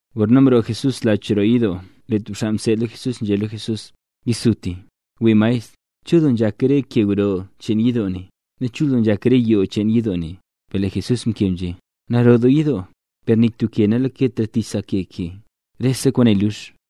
Gorna mroo Jesús lach roo yidoo lee tub xaa mseed lo Jesús nzhé lo Jesús: —¡Yisutisuti, wii maestr! ¡Chul doo nzhak re ke gro cheen yidoo ne, nu chul doo nzhak re yoo cheen yidoo ne! Per lee Jesús mkeb nzhé: —Naro doo yidoo. ¡Per nik tub ke ne nalaketra tich sa ke ke, rese kwaane lux!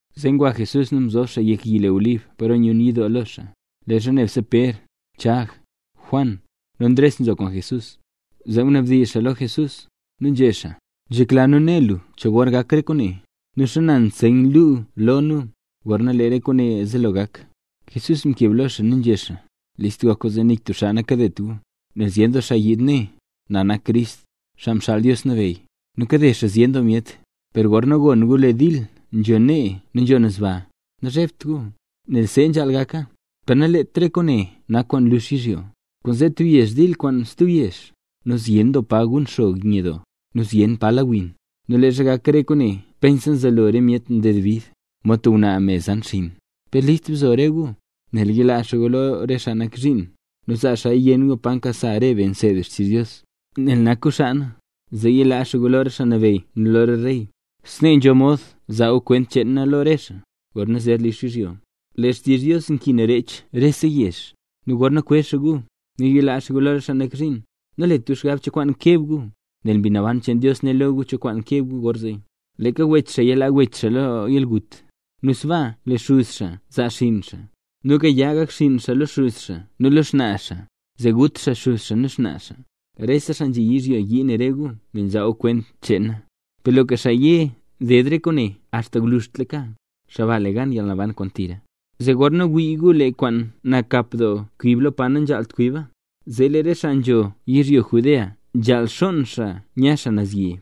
Zee ngwa Jesús nu mzob xaa yek yi le Olib paro nyun yidoo lo xaa. Leezha nebse Pér, Chag, Juan, nu Ndres nzo kwaan Jesús, zee mnabdizh xaa lo Jesús, nu nzhé xaa: —Nzhekla nu né lu lo nu cho gor gak re kwaane. ¿Nu xana nseyn luu lo nu, gorna lee re kwaane zelo gak? Jesús mkeb lo xaa nu nzhé xaa: —List gok gu zee nik tub xaa nakadet gu. Nel zyen doo xaa yiid né: “Na nak Crist, Xaa Mxaal Dios Nabeyy”. Nu kade xaa zyen doo myet. ’Per gorna gon gu lee dil nzho nee nu nzho naz baa, nazhebt gu, nel see nzhaal gaka. Per nalet re kwaane nak kwaan lux yizhyo. Kwaanzee tub yezh dil kwaan stub yezh. Nu zyen doo pa gun xog nye doo, nu zyen doo pa la win. Nu leezha gak re kwaane pensa nzelo re myet nded bid, mod tub ngwnaa me zan xinn. ’Per list bzo re gu, nel yilaa xaa gu lo re xaa nak zhiin, nu zaa xaaya yenn gu pa nkasa re be nseed be xtizh Dios. Nel nak gu xaa na, zee yilaa xaa gu lo re xaa nabeyy nu lo re rey. Snee nzho mod zaa gu kwent cheen na lo re xaa. Gorna zer lux yizhyo, lee xtizh Dios nkin rech rese yezh. Nu gorna kwezh xaa gu, nu yilaa xaa gu lo re xaa nak zhiin; nalet gu xgab cho kwaan keb gu, nel Mbi Naban cheen Dios né lo gu cho kwaan keb gu gorzee. Leeka wech xaa yalaa wech xaa lo yalgut; nu sbaaka lee xuz xaa zaa xaa xinn xaa; nu gaya gak xinn xaa lo xuz xaa nu lo xnaa xaa, zee gut xaa xuz xaa nu xnaa xaa. Rese xaa nzhi yizhyo yii ne rese gu nel nzaa gu kwent cheen na. Per loka xaa ye ded re kwaane axta gwluzhtlaka, xaa ba le gan yalnaban kwaan tira. ’Zee gorna wii gu lee kwaan nakap doo kwib lo pa nanzhaalt kwiba, zee lee re xaa nzho yizhyo Judea nzhaal xonn xaa nya naz yi.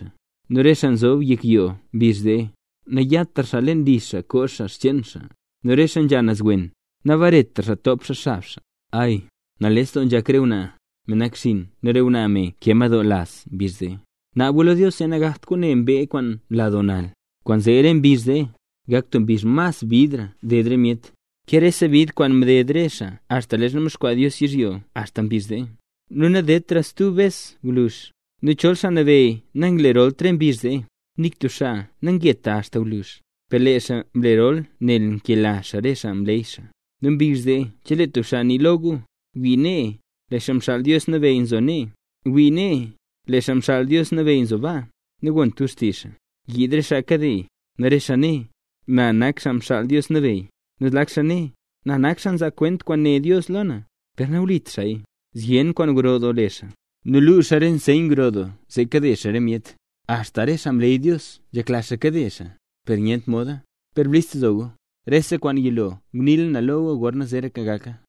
Nu re xaa nzob yek yoo mbizh zee, nayatra xaa leen li xaa koo xaa xcheen xaa. Nu re xaa nzha naz wen, nabaret xaa top xaa xab xaa. Ay, nales doo nzhak re ngwnaa, me nakxiin nu re ngwnaa me nkee madoo laz mbizh zee. Naab gu lo Dios zee nagakt kwaane mbee kwaan nla doo nal. Kwaanzee re mbizh zee, gak tub mbizh mas bidra ded re myet, ke rese bid kwaan mded re xaa axta leezha mdexkwaa Dios yizhyo axta mbizh zee, nu nadedtraya stub bes gwluzh. Nu chol Xaa Nabeyy nanglerolt re mbizh zee, nik tub xaa nangeta axta gwluzh. Per lee xaa mlerola nel nkela xaa re xaa mleey xaa. ’Nu mbizh zee chelee tub xaa nii lo gu: “Wii nee, lee Xaa Mxaal Dios Nabeyy nzo nee”. “Wii nee, lee Xaa Mxaal Dios Nabeyy nzo baa”, nagont gu xtizh xaa. Yiid re xaa kade; nu re xaa né: “Na nak Xaa Mxaal Dios Nabeyy”, nu zlak xaa né: “Na nak xaa nzaa kwent kwaan né Dios lo na”, per nawlit xaaya. Zyen kwaan gro doo le xaa, nu luu xaa re nseyn gro doo zee kade xaa re myet, axta re xaa mleey Dios nzhekla xaa kade xaa, per nyent moda. Per list bzo gu; rese kwaan yilo ngunii na lo gu gorna zeeraka gaka.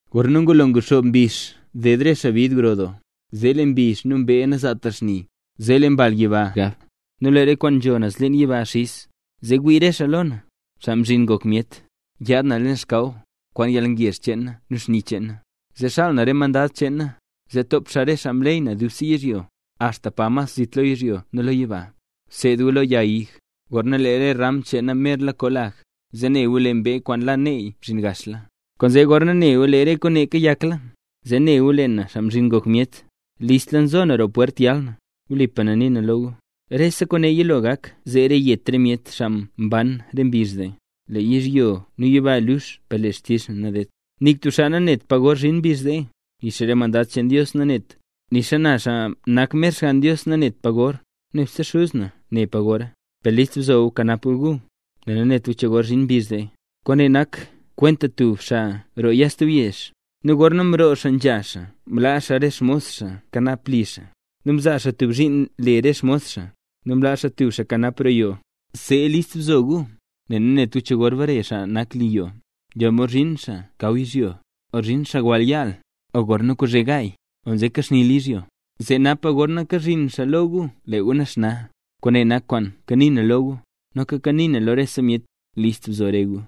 ’Gorna ngulo nguxoob mbizh ded re xaa bid gro doo, zee lee mbizh nu mbee nazaatra xni, zee lee re mbal gab yiba, nu lee re kwaan nzho naz leen yiba xiz. Zee wii re xaa lo na, Xaa Mzhin Ngok Myet, yaad naz leen xkaw, kwaan yalngezh cheen na nu xni cheen na. Zee xaal na re mandad cheen na, zee top xaa re xaa mleey na dubse yizhyo, axta pa mas zit lo yizhyo nu lo yiba. ’Bseed gu lo yag ig, gorna lee re ram cheena merla koo lag, zee ne gu lee mbee kwaan la neey mzhin gaxla. Kwaanzee gorna ne gu lee re kwaane kayakla, zee ne gu lee na, Xaa Mzhin Ngok Myet, listla nzo na roo pwert yal na. Wlipa na nii na lo gu, rese kwaane yilo gak zeera yet re myet xaa mban re mbizh zee. Lee yizhyo nu yiba lux per lee xtizh na nadedt. ’Nik tub xaa nanet pa gor zhin mbizh zee, nixa re mandad cheen Dios naneta, nixa na xaa nak mer Xgann Dios nanet na pa gor, nebse Xuz na ne pa gora. ’Per list bzo gu nu kanap gu gu, nel nanet gu cho gor zhin mbizh zee. Kwaane nak kwenta tub xaa roo ya stub yezh. Nu gorna mroo xaa nzha xaa mlaa xaa re xmos xaa kanap li xaa. Nu mzaa xaa tub zhiin le re xmos xaa. Nu mlaa xaa tub xaa kanap roo yoo. See list bzo gu, nel nanet gu cho gor bare xaa nak li yoo. Nzho mod zhin xaa mkaw yizhyo, o zhin xaa wall yaal, o gorna kozhe gaay, o nzekaxnila yizhyo. Zee napa gorna kazhin xaa lo gu lee gu naxna. Kwaane nak kwaan kanii na lo gu, noka kanii naya lo rese myet: List bzo re gu.